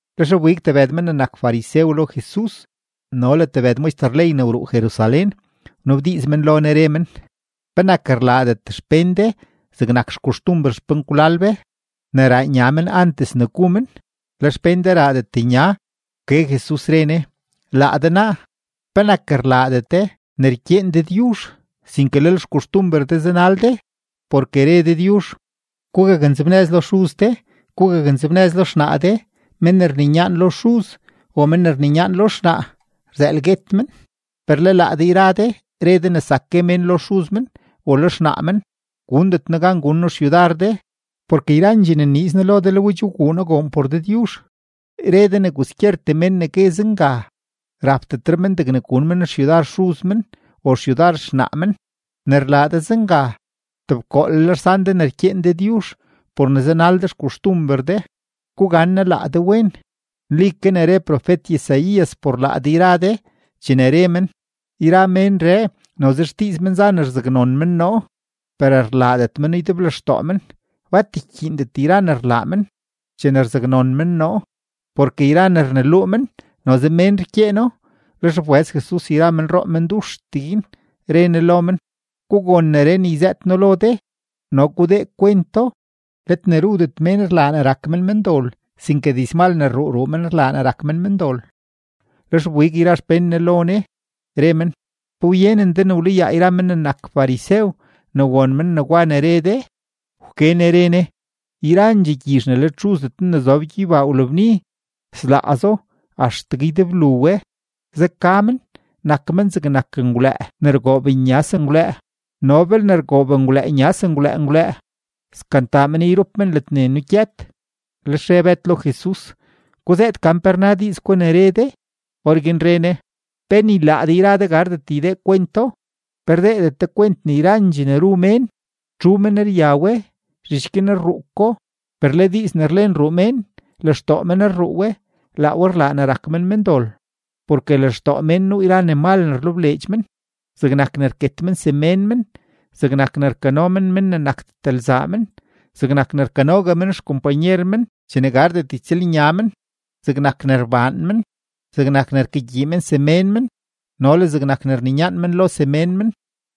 Lex wbig tebëd men ne nak farisew lo Jesus no le tebëd maxter ley ne wruu Jerusalén, wnabdiiz men lo Ne, re men: ―¿Penak rlaadet xpén de zegnak xkoxtumber xpenkwlal be ne raa nya men antes ne gu men, le xpén de raadet nya? Wke Jesus, re Ne: ―Laa de naa, ¿penak rlaadet de ne rkyeen Dëdyuzh, sinke lel xkoxtumber de zanal de? Porke re Dëdyuzh: “Gugaknzebnëz lo xuz de, gugaknzebnëz lo xnaa de”, “Mén ne rninyaan lo xuz o men ne rninyaan lo xnaa, rzëël guet men.” Per le laa de yra de re de ne zak gue mén lo xuz men o lo xnaa men: “Gundet noo gan gun noo xyudar de porke yrandxee ne nniiz noo lo de le we che wguu noo goon por Dëdyuzh”; re de ne kwaskyertee men ne gue zenga, rapdetre men degne gun men xyudar xuz men o xyudar xnaa men. Ne rlaa de zenga, tebkoolel rsan de ne rkyeen Dëdyuzh por ne zanal de xkoxtumber de. Gugannaa laa de wen. Nli ke ne re profet-Isaías por laa de yra de chene re men: Yra ménree noze xdiiz men za ne rzaknon men noo, per rlaadet meno ydeblextoo men. Bat rkyiindet yra ne rlaa men chene rzaknon men noo, porke yra ne rneluu men, noze mén rkyeeno. Lex wbëz Jesus yra menroo menduxtee guin, re Ne lo men: ―Gugon neree ne yzëët noo lo de no gudee kwento: Let ne rudet mén rlaa ne rak men mendol, sinke dizmal ne rruu ruu men rlaa ne rak men mendol. Lex wbig yra xpén Jesus lo Ne, re men: ―¿Pe wyenen de ne wlayaa yra men ne nak farisew ne won men negwa ne re de? Wke Ne re Ne: ―Yrandxee gyizh ne let Xuzdet noo ne zob gyeybaa wlabni, slaazo axtegue ydeblu we. Zeka men; nak men zegnak menngwlëë ne rgoob nya sengwlëë; no belne rgoob ngwlëë nya sengwlëë ngwlëë, skantaa men yrup men ledne nugyët. Lex re Bëd lo Jesus: ―Guzëët gan pe rna diiz gwa ne re de. Orguin re Ne: ―¿Pe ni laa de yra de gardet ydeedet kwento? ¿Pe rdeedet de kwent ne yrandxee ne ru mén, txu men rya we, zhich guin rruu ko? Per le diiz ne rlen ruu mén, lextoo men rruu we; laa we rlaa ne rak men mendol. Porke lextoo mén nuu yra ne mal ne rlebleedx men, zegnak ne rket men semén men, zegnak ne rkano men mén ne nakdet lzaa men, zegnak ne rkanogue men xkompanyer men chene gardet ytsëlnya men, zegnak ne rbaan men, zegnak ne rkagyii men semén men, no le zegnak ne rninyaan men lo semén men.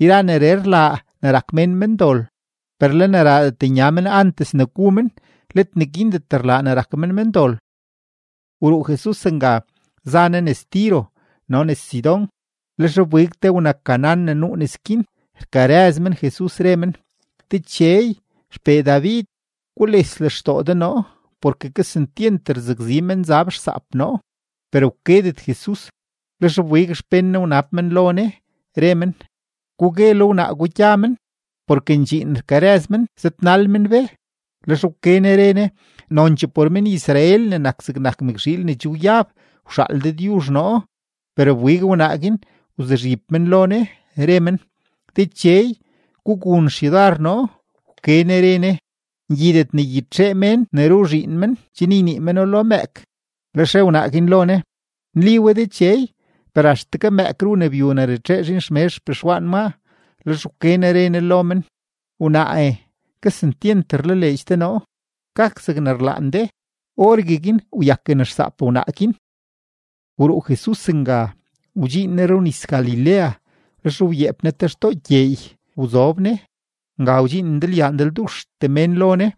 Yra neree rlaa ne rak mén mendol; per le ne raadet nya mén antes ne gu men, let neguindet rlaa ne rak mén mendol. Wruu Jesus nga, za Ne nes Tiro no le nes Sidón. Lex wbig te wna-Canaán ne nuu nes guin rkarëz men Jesus, re men: ―¡Dechey, XPee David, gules lextoo de noo! Porke kesentyent rzakzi menzab xsaap noo. Per wkedet Jesus. Lex wbig xpén Ne wnab men lo Ne, re men: ―Gugue lo wnaa gwa gya men, porke ndxiin rkarëz men zëdnal men be. Lex wke Ne re Ne: ―Nonchee por men-Israel ne nak zegnak mëkzhiil ne che wyab wxaal Dëdyuzh noo. Per wbig wnaa guin wzuzhib men lo Ne, re men: ―¡Dechey, gugun xyudar noo! Wke Ne re Ne: ―Ngyidet ne ygyitxee mén ne ru zhiin men chen ynii meno lo mëëk. Lex re wnaa guin lo Ne: ―Nli we Dechey; per axtegue mëëk ru ne byu ne ratxee zhiin xmezh xpexwaan maa. Lex wke Ne re Ne lo men: ―¡Wnaae, kesentyent rlaleedx de noo! Gak zegne rlaan de. Orgueguin wyaken xsaap wnaa guin. Wruu Jesus nga, wdxiin Ne runis-Galilea. Lex wyeep Ne te xtoo gyeey wzob Ne. Nga wdxiin ndalyaa ndalduxtee mén lo Ne,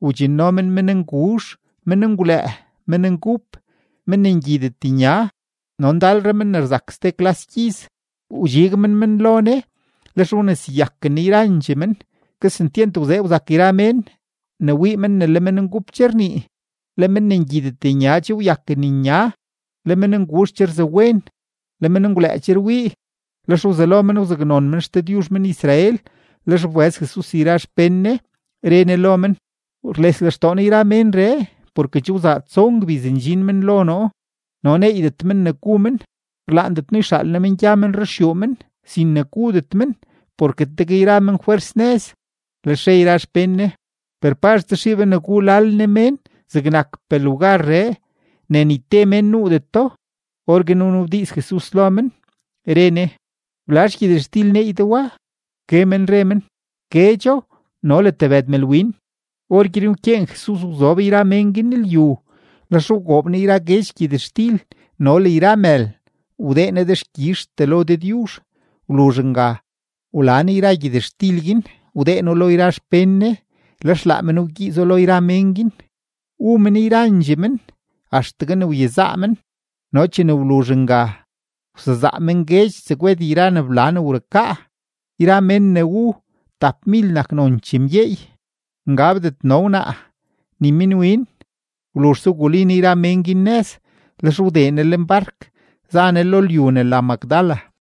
wdxinno men mennguzh, menngwlëë, menngup, men ne ngyidet nya, no ndalre men ne rzak ste klas gyiz; wdxig men men lo Ne, lex wneseyaken Ne yrandxee men. Kesentyent wzee wzak yra mén ne wii men ne le menngup che rnii, le men ne ngyidet nya che wakwen nya, le mennguzh che rzawen, le menngwlëë che rwii. Lex wzelo men wzaknon men XDëdyuzh men-Israel. Lex wbëz Jesus yra xpén Ne, re Ne lo men: ―Rles lextoo noo yra ménree, porke che wzaa tson gbiz ndxin men lo noo no neeydet men ne gu men. Rlaandet noo yxaal noo men gya men ruxyuu men sin ne gudet men, porke tegue yra men fwers nëz. Lex re yra xpén Ne: ―Per ¿pazh tsaxii be ne gu lal nee mén zegnakpee lugarree ne ni te mén nuudeto? Orguin wnabdiiz Jesus lo men, re Ne: ―¿Blazh gyëtxtil neey de wa? Wke men re men: ―Guedxo no le tebëd mëlwin. Orguin wkyeen Jesus wzob yra mén guin lyu. Lex wgoob Ne yra guedx gyëtxtil no le yra mël, wdee Ne dexkyizhtee lo Dëdyuzh. Wluzh nga wla Ne yra gyëtxtil guin, wdee No lo yra xpén Ne, lex laa men wgyiizo lo yra mén guin. Wu men yrandxee men axtegue ne wyezaa men, no chene wluzh nga, wsezaa men guedx tsegwed yra ne bla ne wrukaa. Yra men ne wu, tapmil nak nonchee mgyeey, ngabdet no wnaa ni minwin. Wluzhse, wguli Ne yra men guin nëz, lex wdee Ne lenbark za Ne lo lyu ne la Magdala.